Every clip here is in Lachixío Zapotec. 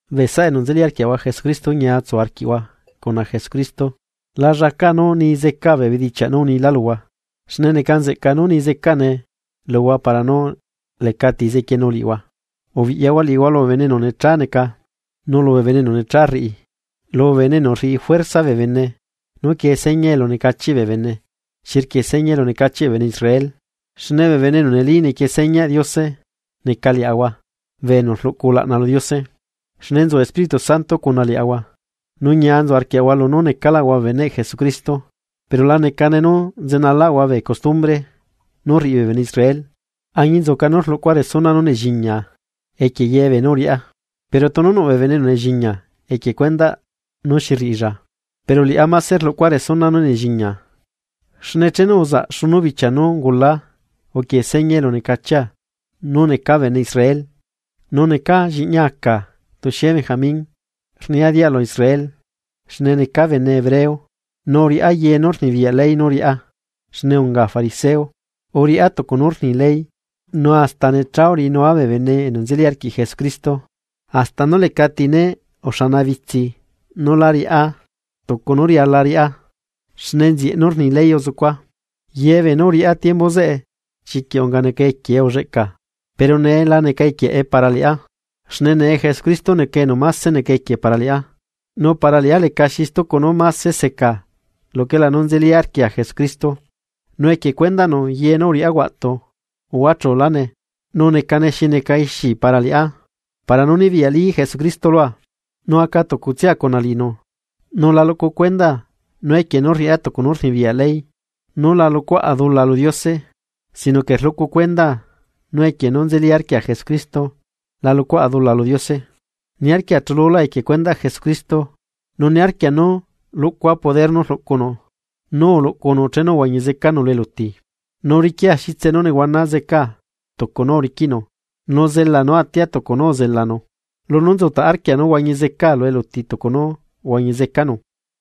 Bee saꞌa enu nzeli arquiaꞌahua Jesucristo ñia tsu arquiꞌhua cuna Jesucristo, la llaca nú nii zecaa bee bedichiaꞌ nú unilá luhua, xne neca nzeꞌca nú ni zecane luhua para nú lecati zequienu liꞌihua. Ubiꞌyahua liꞌihua lubee bene enu necha neca, nu lubee bene enu necha rriꞌi, lubee bene enu rriꞌi juerza bee bene nú quie seña elunecahiꞌ bee bene xi rquie seña elunecachiꞌ bee bene Israel. Xne bee bene enu neli nequie señaꞌ Diose neca liaꞌahua bee enu rluꞌcu ulaꞌna lu Diose, xne nzu Espíritu Santo cuna liaꞌahua, nu ñia nzu arquiaꞌahua lunú necaꞌlaꞌahua beneꞌ Jesucristo, pero la necane nú nzenalaꞌahua bee custumbre nú rriꞌi bee bene Israel. Añinzuca nú rluꞌcua resuna nú nelliñiaa, equie ye beenú uriꞌá, pero tunu nuꞌ bee bene enu nelliñia equie cuendaꞌ nú xi rriꞌilla, pero liꞌá máse rluꞌcua resuna nú nelliñiaa. Xne chenu uzaꞌ xunu bichia nú ungulaa uquie seña elunecachia nú necaa bene Israel nu necaa lliꞌñi aca tuxie Benjamín, rnia dialu Israel xne neca bene hebreo, nu uriꞌá ye nú rnibiyaꞌ ley nú riꞌá, xne unga fariseo. Uriꞌá tucu nú rni ley, nu hasta necha uriꞌinua bee bene enu nzeli arquiꞌ Jesucristo, hasta nú lecati né uxanabitsi nú lá riꞌá tucu nú riala riꞌá xne nzieꞌ nú rni ley uzucua. Ye beenú uriꞌá tiembu zeꞌe chiquiꞌ unga neca equiee ulleꞌca, pero nee la neca equieꞌae para liꞌá, xne nee Jesucristo neca enu máse neca equie para liꞌá. Nu para liꞌá lecaxi stucu nú mase seca luquela nú nzeli arquia Jesucristo, nu equie cuendaꞌnu ye nú uriꞌá huaꞌtu uhuachulane, nu necane xi neca ixi para liꞌá para nú nibiyaꞌli Jesucristo lua, nu aca tucutsia cuna liꞌinu. Nu la luꞌcu cuendaa nú equie nú rriꞌá tucu nú rnibiyaꞌ ley nú la luꞌcuaꞌa dula lu Diose sino que rluꞌcu cuendaa nú equie nú nzeli arquia Jesucristo la luꞌcuaꞌa dula lu Diose. Niarquia chululá equie cuendaꞌ Jesucristo, nu niarquia nú luꞌcua poder nú uluꞌcunu, nú uluꞌcunu chenu uhuañi zecanu lu eluti, nu riquia xitse nú nehuana zeca tucu nú uriquiꞌnu, nu zela nú atia tucu nú uzelanu. Lunú nzutaꞌ arquia nú huañi zecaa lu eluti tucu nú uhuañizecanu.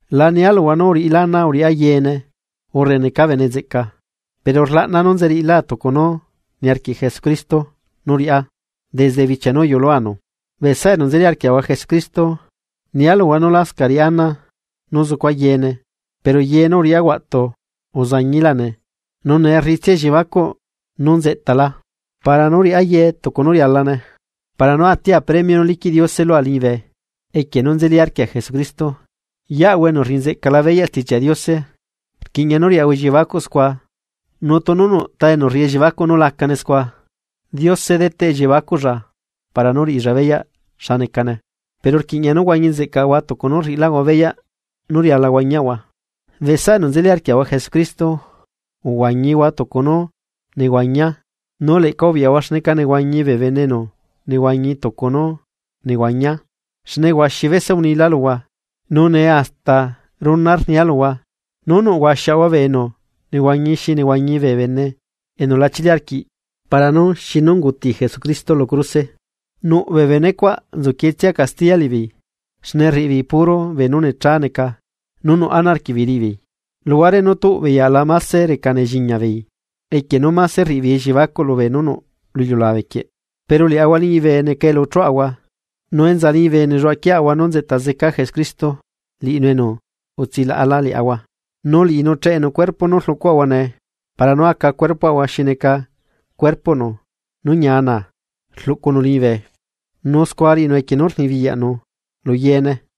La nia luhua nú uriꞌilá ana uriꞌá yeene, urre neca bene nzeꞌca, pero rlaꞌna nú nzeriꞌilá tucu nú niarquiꞌ Jesucristo nú riꞌá desde bichia nú uyuꞌuluanu. Bee saꞌa enu nzeli arquiaꞌahua Jesucristo, nia luhua nú lascaꞌ riꞌa ana nú zucua yeene, pero ye nú uriꞌá huaꞌtu uzañiláne, nu nee rriꞌitsia elliebacuꞌ nú nzeꞌtala, para nú riꞌá yeene tucu nú rialane, para nú atia premio nú liquiꞌ Diose lua liñibe equie nú nzeli arquia Jesucristo. Yeꞌahua enu rriꞌi nzeꞌcala beyaꞌ Stichiaꞌ Diose, rquiꞌña nú riaꞌahua elliebacuꞌ scua nu tunu nuꞌta enu rriꞌi elliebacuꞌ nú lacane scua, Diose deteꞌ elliebacuꞌlla para nú úriꞌilla beyaꞌ xa necane. Pero rquiꞌña nú huañi nzeꞌcaꞌahua tucu nú rriꞌilaꞌahua beyaꞌ nú riala huañiaꞌahua. Bee saꞌa enu nzeli arquiaꞌahua Jesucristo, uhuañihua tucu nú nehuañiaa nu leꞌca ubiꞌyahua xneca nehuañi bee bene enu nehuañi tucu nú nehuañiaa. Xne huaxi bese unila luhua, nu nee hasta runa rnia luhua nú nuꞌ huaxiaꞌahua bee enu nehuañi xi nehuañi bee bene enu lachili arquiꞌ para nú xi nú unguti Jesucristo lu cruse. Nuꞌ bee bene cuaꞌ nzuquietsia castiya liꞌibeei xne rriꞌibeei puro beenú necha neca nú nuꞌ ana arquiꞌbeei riꞌibeei, luhuare nú tuꞌbeei aꞌla mase reca nelliñiabeei equie nú mase rriꞌibeei elliebacuꞌ lubee nú nuꞌ lu iliulabe quieꞌ. Pero liaꞌahua liñibe neca elu chuaꞌahua, nu enza liñibe nelluaꞌa quieꞌahua nú nzeꞌta zeca Jesucristo liꞌinu enu utsilaꞌala liaꞌahua. Nu liꞌinu cheꞌenu cuerpo nú rluꞌcuaꞌahua nee para nú aca cuerpoꞌahua xi neca cuerpoꞌnu nú ñia naa rluꞌcunu liñibe, nu scua riꞌinu equie nú rnibiyaꞌnu lu yeene.